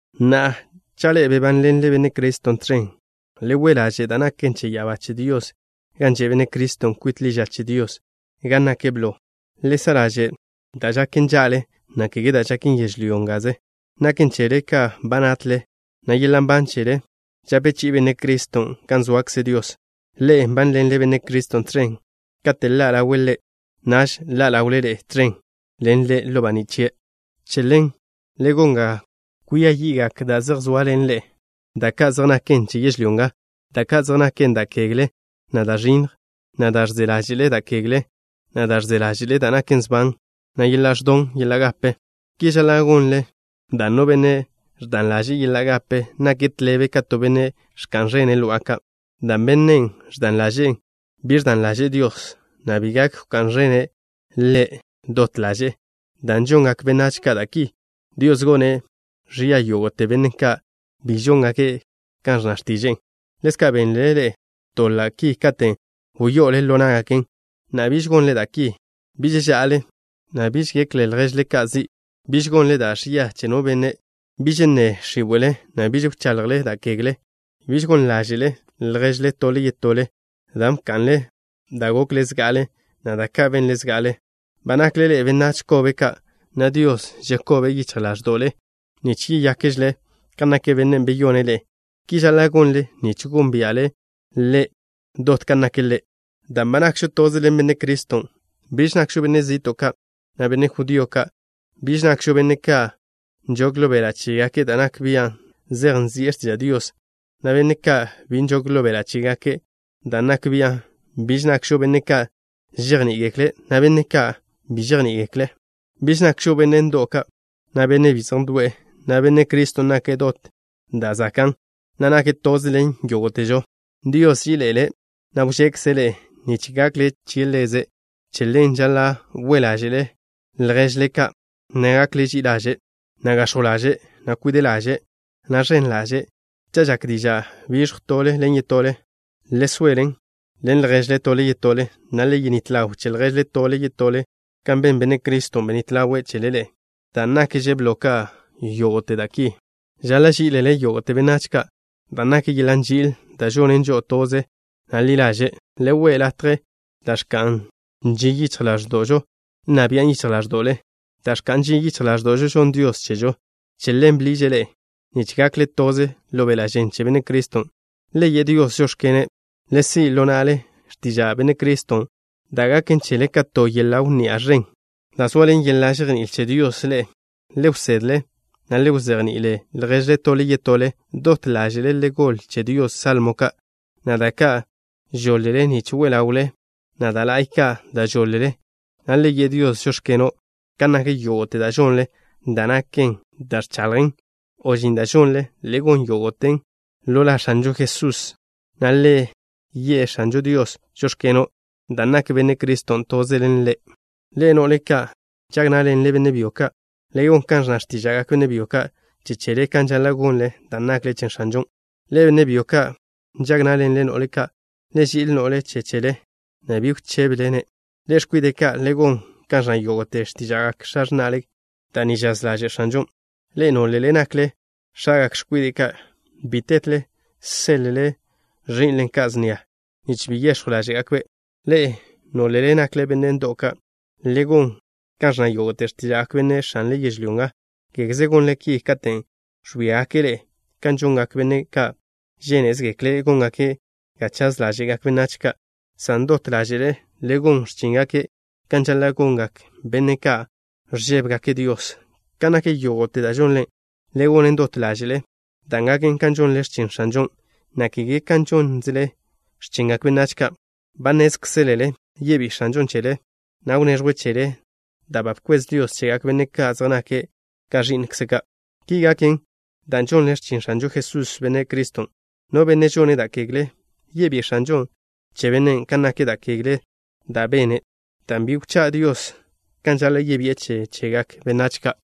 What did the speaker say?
Na'a, cha' ḻe'e bebánḻenle Benne' Criston' tẕen, le we' ḻaže' da' naken che ya'abá che Dios gan že' Benne' Criston' kwit ḻi ža che Dios, gan nake' blo. Le sa' ḻaže' da' žaken ža'le, na' kege da' žaken yežlyó ngaze. Naken chele ka ba natle, na' yeḻa' nban chele žape chi'i Benne' Criston' gan zoakze Dios. Ḻe'e nbánḻenle Benne' Criston' tẕen. Kate' ḻa' ḻawe' Ḻe', naž ḻa' ḻawle ḻe'e tẕen ḻen Ḻe' ḻo baní' chie'. Che ḻen, le gon ga kwia yi'gak da' zej zoaḻen ḻe'e, da ka' zej naken che yežlyó nga, da ka' zej naken: Da' kegle, na' da' ẕinnj, na' da' ẕze ḻáže'le da' kegle, na' da' ẕze ḻáže'le da' naken sban, na' yeḻa' ẕdan yeḻa' gape. Ki žaḻa' gonle dan' no benne' ẕdan laže'e yeḻa' gape nake' tḻebe ka to benne' ẕka'n ẕene' lo'a ka', dan' bennen' ẕdan ḻaže'en bi ẕdan ḻaže'e Dios, na' bi gak wká'n ẕene' Ḻe' dot ḻaže'e. Dan' žongak benách ka' da' ki, Dios gone' ẕia yógo'te benne' ka' bi žóngake' kan ẕnna x̱tiže'e. Ḻezka' benle ḻe'e doḻa' ki katen' wyo'ole ḻo ná'gaken. Na'a, biž gonle da' ki: Biž ža'ale, na' biž gekle lježle ka' zi'. Biž gonle da' ẕia che no benne'. Biž nne x̱íwe'le, na' biž wchaḻjle da' kegle. Bi gon ḻáže'le lježle tole yetole dan' ba bka'nle da' gokle zga'ale, na' da' ka' benle zga'ale. Ba nakle ḻe'e benách kobe ka', na' Dios žekobe' yichj ḻáẕdo'le nich yeyákžele kan nak Bennen' beyone' ḻe'e. Ki žaḻa' gonle nich gónbia'le Ḻe' dot kan nake' Ḻe'. Dan' ba nakžo toze ḻen Benne' Criston': Biž nakžo benne' zi'to' ka', na' benne' judío ka'. Biž nakžo benne' ka' nžog ḻo beḻa' chégake' da' nak bian' zej nzi'e x̱tiža' Dios, na' benne' ka' bi nžog ḻo beḻa' chégake' dan' nak bian'. Biž nakžo benne' ka' žejní'igekle', na' benne' ka' bi žejní'igekle'. Biž nakžo benne' ndo'w ka', na' benne' bi zej ndo'e. Na'a, Benne' Criston' nake' dot da' zakan', na' nake' toze ḻen yógo'težo. Dios nži'ile' ḻe'e, na' wžekze' ḻe'e nich gakle che Ḻeze'. Che ḻen, žaḻa': We' ḻáže'le lježle ka', na' gakle ži'i ḻaže', na' gax̱jw ḻaže', na' kwide' ḻaže', na' ẕen ḻaže'. Cha' žak diža' biẕjw tole ḻen yetole, le soele ḻen lježle tole yetole, na' le yenít ḻaw che lježle tole yetole kan ben Benne' Criston', benít ḻawe' chele ḻe'e. Da' nakže blo ka yógo'te da' ki, žaḻa' ží'ilele yógo'te benách ka', dan' nak yeḻa' nži'il da' žonen žo'o toze, na' ḻi ḻaže'. Le we' latje da' ẕka'n ži yichj ḻáẕdo'žo nna bian' yichj ḻáẕdo'le. Dan' ẕka'n žin yichj ḻáẕdo'žo žonn Dios chežo. Che ḻen bḻiže' ḻe'e, nich gakle toze ḻo beḻa' žen che Benne' Criston'. Le ye' Dios: “Žóx̱keno'.” Le si' ḻo na'le x̱tiža' Benne' Criston' da' gaken chele ka to yeḻa' wnni'a ẕen. Dan' zoaḻen yeḻa' žejní'il che Dios ḻe'e, le wsedle, na' le wzejni'ile lježle tole yetole. Dot ḻáže'le le goḻ che Dios salmo ka', na' da' ka' žoḻ-le nich we ḻawle Ḻe', na' da' la'y ka' da' žoḻ-le, na' le ye' Dios: “Žóx̱keno'.” Kan nak yógo'te da' žonle, da' naken da' ẕchaḻjlen o žin da' žonlen, le gon yógo'ten ḻo la X̱anžo Jesusen', na' le ye' X̱ažo Dios: “Žóx̱keno'” dan' nak Benne' Criston' toze ḻen ḻe'e. Ḻe'e, no'le ka' nžag ná'ḻenle benne' byo ka', le gon kan ẕnna x̱tíža'gak benne' byo che chele, kan žaḻa' gonle, dan' nakle che X̱anžon'. Ḻe'e, benne' byo ka' nžag ná'ḻenle no'le ka', le ži'il no'le che chele, na' bi wchébele-ne'. Ḻe'e, x̱kwide' ka', le gon kan ẕnna yógo'te x̱tíža'gak x̱a x̱na'le. Da' ni žaz ḻaže' X̱anžon'. Ḻe'e, nólele nakle x̱agak x̱kwide' ka', bi tetle seḻ-le ẕi'nle ka' snia, nich bi yex̱jw ḻáže'gakbe'. Ḻe'e, nólele nakle benne' ndo'w ka', le gon kan ẕnna yógo'te x̱tíža'gak benne' x̱anle yežlyó nga. Kégeze gonle ki katen' ẕwíagake' ḻe'e kan žongak benne' ka' žénezegekle' góngake' ga chaz ḻáže'gak benách ka', san dot ḻáže'le le gon x̱chíngake' kan žaḻa' gongak benne' ka' ẕžébegake' Dios. Kan nak yógo'te da' žonle, le gonen dot ḻáže'le, dan' gaken kan žonle x̱chin X̱anžon', na' kege kan žónzele x̱chingak benách ka'. Ba nnézkzelele yebí'i X̱anžon' chele, na' wneẕjwe' chele da' ba bkwez Dios chegak benne' ka' zej nake' ka ẕi'nkze' ka'. Ki gaken dan' žonle x̱chin X̱anžo Jesús, Benne' Criston'. No benne' žone' da' kegle, yebí'i X̱anžon' che bennen' kan nak da' kegle da' bene', dan' bi wchá' Dios kan žaḻa' yebi'e che chegak benách ka'.